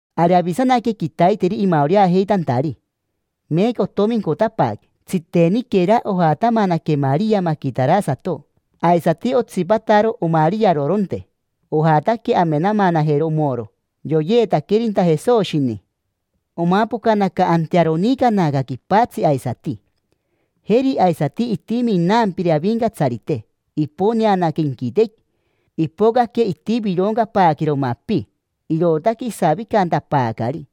Ari avisanaque quitaiteri imaoreajeitantari, meeca otomincotapaaque. Tsiteniquera ojatamanaque Maria maquitarasato, aisati otsipataro omariaroronte. Ojataque amenamanajero omoro yoyeetaquerinta Jesoshini. Omapocanaca antearo onicanaca quipatsi aisati. Jeri aisati itimi inampire Avincatsarite: iponeanaca inquitequi, ipocaque itivironcapaaquero mapi, irootaque isavicantapaacari.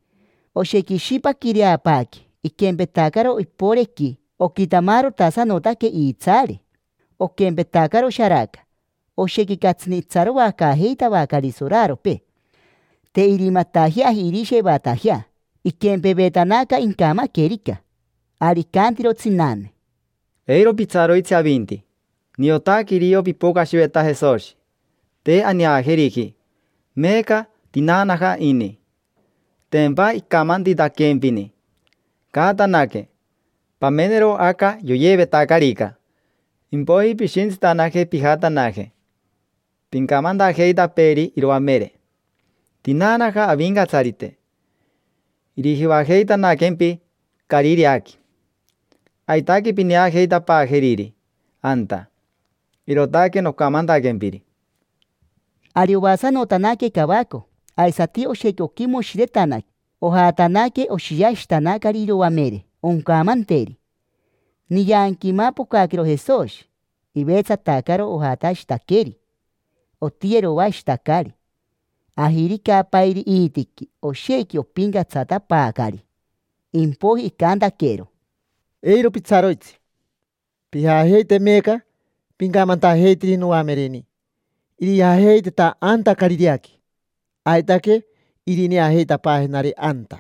Oshequi ishipaquireapaaque, iquempetacaro iporequi. Oquitamarotasanotaque iitsaare, oquempetacaro sharaca. Oshequi catsini itsaroacaajeitavacari soraropee, te irimatajeaji irishevatajea: iquempevetanaca incamaquerica. Ari icantiro tsinane: —Eiro pitsaroitsi avinti. Niotaque irio pipocashiveta Jesoshi. Te aneajeriji meeca, tinaanaja ini. Tempa icamantitaquempini. Caatanaque, pamenero aca yoyeevetacarica. Impoiji pishintsitanaje pijatanaje pincamantajeitapeeri iroamere: “Tinaanaja Avincatsarite, irijivajeitanaquempi Carireaqui. Aitaque pineajeitapaajeriri anta”. Irootaque nocamantaquempiri. Ari oasanotanaque cavaco, aisati oshequi oquimoshiretanaque. Ojatanaque, oshiashitanacari iroamere, oncamanteri. Nianqui imapocaquero Jesoshi, ivetsatacaro. Ojatashitaqueri, otiyeroashitacari, ajiricapairi iitiqui. Oshequi opincatsatapaacari. Impoiji icantaquero: —Eiro pitsaroitsi. Pijajeite meeca pincamantajeiteri noamereni irijajeiteta anta Carireaqui. Aitaque irineajeitapaajenari anta.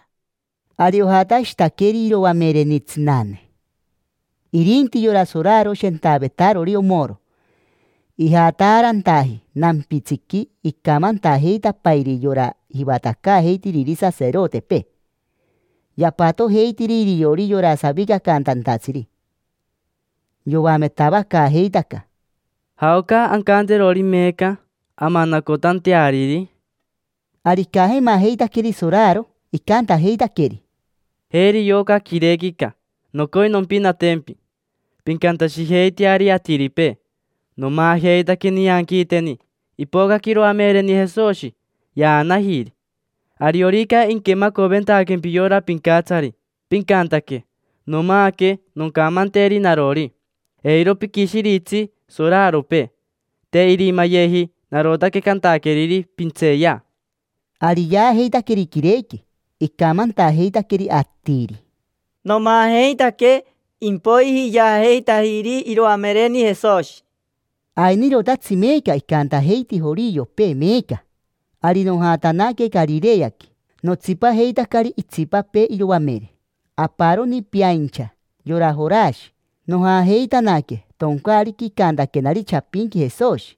Ari ojatashitaqueri iroamereni tsinane. Irinti yora soraro shentavetarori omoro ijataarantaji nampitsiqui, icamantajeitapairi yora jivatacaajeitiriri saserotepee. Yapatojeitiri iriori yora savicacantantatsiri. Yoametavacaajeitaca: —¿Jaoca ancanterori meeca amanacotanteariri? Ari icajemajeitaqueri soraro, icantajeitaqueri: —Jeri yoca quirequica, nocoi nompinatempi. Pincantashijeiteari atiripee: “Nomaajeitaque nianquiiteni. Ipocaque iroamereni Jesoshi, yaanajiri”. Ariorica inquemacovetaquempi yora pincatsari, pincantaque: “Nomaaque”, noncamanteri narori: “Eiro piquishiritsi soraropee. Te irimayeji. Narotaque cantaqueriri: ‘Pintseeya’”. Ari yaajeitaqueri quirequi, icamantajeitaqueri atiri: “Nomaajeitaque, impoiji yaajeitajiri iroamereni Jesoshi”. Ainirotatsi meeca icantajeiti joriopee meeca. Ari nojatanaque Carireaqui, notsipajeitacari itsipapee iroamere. Aparoni peaincha, yora Jorashi. Nojajeitanaque toncaariqui icantaquenari chapinqui Jesoshi.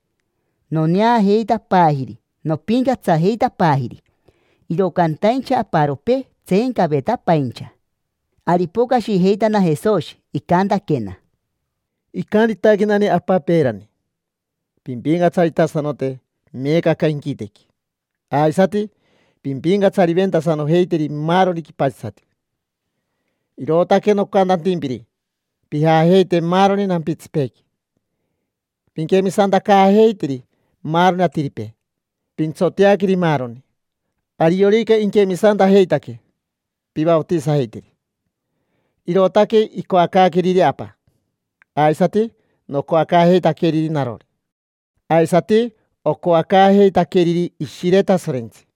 Noneajeitapaajiri, nopincatsajeitapaajiri. Iro cantaincha aparopee tseencavetapaincha. Ari ipocashijeitana Jesoshi, icantaquena: —Icantitaquenani Apa peerani: “Pimpincatsaritasanote meeca aca inquitequi aisati pimpincatsariventasanojeiteri maaroni quipatsisati”. Irootaque nocantantimpiri: pijajeite maaroni nampitsipeequi, pinquemisantacaajeiteri maaroni atiripee, pintsoteaqueri maaroni. Ariorica inquemisantajeitaque, pivaotisajeiteri: irootaque icoacaaqueriri Apa, aisati nocoacaajeitaqueriri narori, aisati ocoacaajeitaqueriri Ishire Tasorentsi.